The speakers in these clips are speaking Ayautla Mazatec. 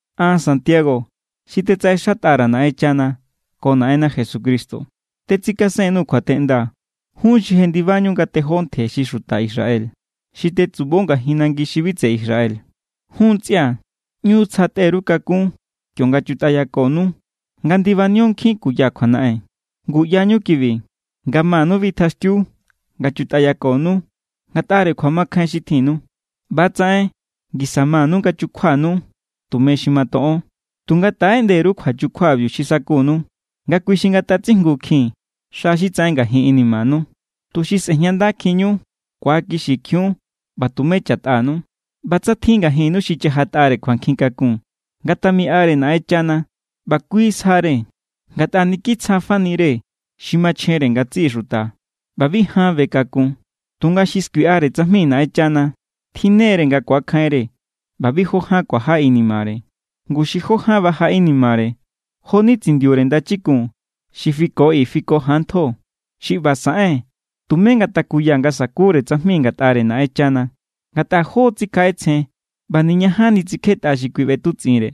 An, Santiago, xi tetsaꞌexatꞌa_ra̱ Naꞌenchana ko Naꞌenna Jesucristo, tetsikasen_nuu̱ kjuateꞌnda jun xi jendibañu nga tejó ntje xi xuta Israel, xi tetsubo ngajin nangi xi bi tseꞌe Israel. Jun ntsꞌia̱, ꞌñu tsja tꞌe_ru kakún kionga chutꞌayakonu nga ndibanio nkjin kuya kjuanaꞌen. Ngu ꞌyañu kibi, nga manu bitjaxtiu nga chutꞌayakonu ngatꞌare kjuamakjain xi tjinnu, ꞌba=tsaꞌen ngisa manu nga chukjuanu tume xi matoꞌon. Tunga taꞌeꞌnde_ru kjuachukjuabiu xi sakunu nga kui xi ngatatsijngukjin xa xi tsaꞌen ngajin inimanu, tuxi sꞌe̱jñandakjinñu, ku̱akixikjiun, ꞌba tumé cha̱tꞌanu. ꞌBa tsa tjin ngajinnu xi chajatꞌare kjuankjin kakun, ngatamiꞌare Naꞌenchana. ꞌBa kui sjare, ngatꞌa niki tsjafani=re xi machjenre ngatsiꞌi xuta ꞌba bi jan be kakun. Tunga xi skuiꞌare tsajmi Naꞌenchana tjinne=re nga ku̱akjainre ꞌba bi jó ján kuaja inimare. Ngu xi jó ján baja inimare, jo=ni tsindiure ndachikun xi fiko i fiko jan ntjo. Xi ꞌba saꞌen, tumé ngatakuya nga sa̱kure tsajmi ngatꞌare Naꞌenchana, ngatꞌa jó= tsikjaꞌetsjen ꞌba niñajanni tsikjetꞌa xi kui ꞌbetutsꞌinre.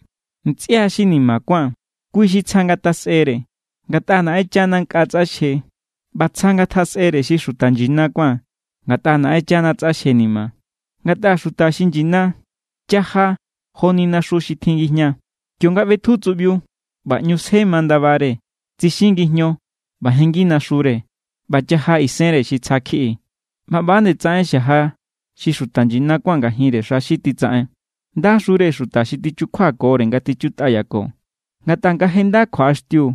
Ntsꞌia xi ni̱ma̱ kuán, kui xi tsja ngatjasꞌere, ngatꞌa Naꞌenchana nkꞌa tsꞌaxje. ꞌBa tsja ngatjasꞌere xi xuta nyina kuán, ngatꞌa Naꞌenchana tsꞌaxjenima. Ngatꞌa xuta xi nyina chaja joni naxu xi tjin ngijña. Kionga ꞌbetju tsuꞌbiu ꞌba ꞌñu sje ma ndabare, tsixi ngijño, ꞌba jenngi naxure, ꞌba chaja isenre xi tsja kjiꞌi. ꞌBa ꞌba=nde tsaꞌen xaja xi xuta nyina kuán ngajinre xa xi titsaꞌen. Ndaxure xuta xi tichjukjuakore nga tichutꞌayako, ngatꞌa nga je nda kjuaꞌaxtiu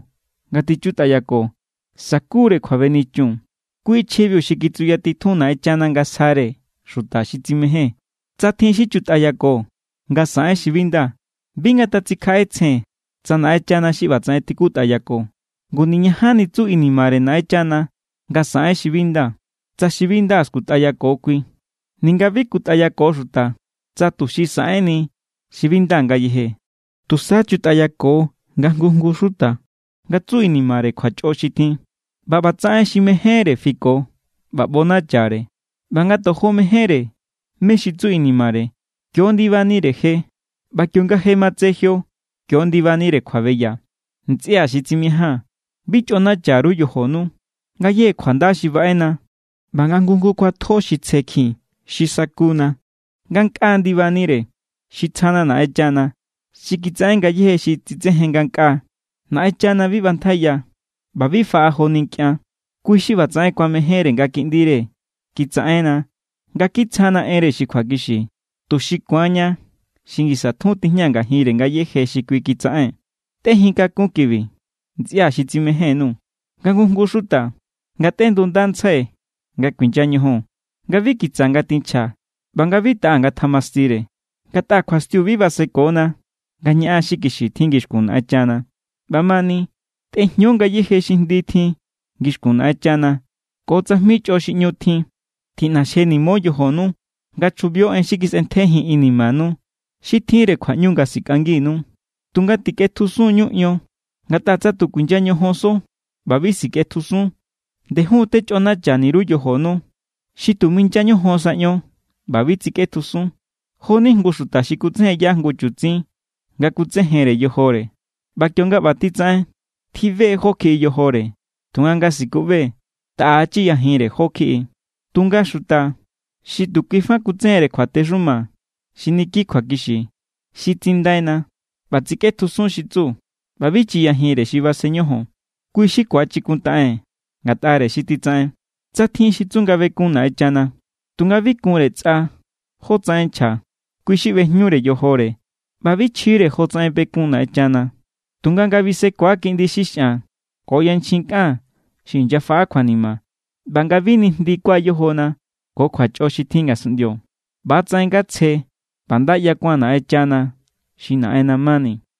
nga tichutꞌayako, sa̱ku=re kjuabenichun. Kui chjibiu xi kitsuyatitjun Naꞌenchana nga sjare xuta xi tsimején. Tsa tjin xi chutꞌayako nga saꞌen xi bi nda, bi ngatatsikjaꞌetsjen tsa Naꞌenchana xi ꞌbatsaꞌen tikutꞌayako. Ngu niñajanni tsu inimare Naꞌenchana nga saꞌen xi bi nda, tsa xi bi nda skutꞌayako kui, ninga bi kutꞌayako xuta tsa tuxi saꞌenni xi bi nda ngayeje. Tusa chutꞌayako nga jngu jngu xuta nga tsu inimare kjuachꞌo xi tjin, ꞌba ꞌbatsaꞌen xi mejénre fiko ꞌba ꞌbonachare. ꞌBa nga tojo mejénre mé= xi tsu inimare, kio= ndibanire je. ꞌBa kionga je matse jio, kio= ndibanire kjuabeya. Ntsꞌia̱ xi tsimijaa̱n, bi chꞌonacha_ru yojonu. Ngayéje kjuanda xi baꞌena ꞌba nga jngu jngu kjuatjo xi tsjekjin xi sakuna, ngankꞌaa ndibanire. Xi tsjana Naꞌenchana xi kitsaꞌen ngayéje xi tsitsejen ngankꞌaa. Naꞌenchana bi ꞌbantjaiya, ꞌba bi faꞌa joni nkꞌian. Kui xi ꞌbatsaꞌen kuamejénre nga kiꞌndire kitsaꞌenna nga kitsjana enre xi kjuakixi, tuxi ku̱anña xi ngisa tjun tijña ngajinre ngayéje xi kui kitsaꞌen. Tꞌejin kakún kibi, ntsꞌia̱ xi tsimején_nuu̱. Nga jngu jngu xuta ngatꞌendundantsjai nga kuinya ñojon, nga bi kitsa ngatinchja ꞌba nga bi taꞌa ngatjamastire. Ngatꞌa kjuastiu bi basekona nga ñaꞌan xi kixi tjin ngixkun Naꞌenchana. ꞌBamani, tꞌejño ngayéje xi jndi tjin ngixkun Naꞌenchana ko tsajmi chꞌo xi ꞌñu tjin. Tiꞌnaxjenimo yojonu nga chjubio en xi kisꞌentjejin inimanu. Xi tjinre kjuaꞌñu nga sikꞌanginu. Tunga tikꞌetjusun=ñu ion, ngatꞌa tsa tu kuinya ñojonso ꞌba bi sikꞌetjusun, ndejun techꞌonacha_ru yojonu. Xi tu minya ñojon sa ion ꞌba bi tsikꞌetjusun, jo=ni jngu xuta xi kutsejenya jngu chutsin nga kutsejenre yojore. ꞌBa kionga ꞌba titsaꞌen, tjibe= jó= kjiꞌi yojore. Tunga nga sikuꞌbe, taꞌa chiyajinre jó= kjiꞌi. Tunga xuta xi tu kui fa kutsejenre kjuatexuma xi niki kjuakixi, xi tsindaina, ꞌba tsikꞌetjusun xi tsu ꞌba bi chiyajinre xi basen ñojon, kui= xi ku̱achikuntaꞌen ngatꞌare xi titsaꞌen. Tsa tjin xi tsu nga bekun Naꞌenchana, tunga bi kunre tsꞌa jótsaꞌen nchja, kui xi ꞌbejñure yojore ꞌba bi chjire jotsaꞌen bekun Naꞌenchana. Tunga nga bisekua kiꞌndi xi xꞌan ko yanchjin kꞌan xi inyafaꞌa kjuanima, ꞌba nga bi nijndikua yojona ko kjuachꞌo xi tjin ngasunꞌndio, ꞌba=tsaꞌen nga tsje ꞌba nda ꞌyakuan Naꞌenchana xi Naꞌenna mani.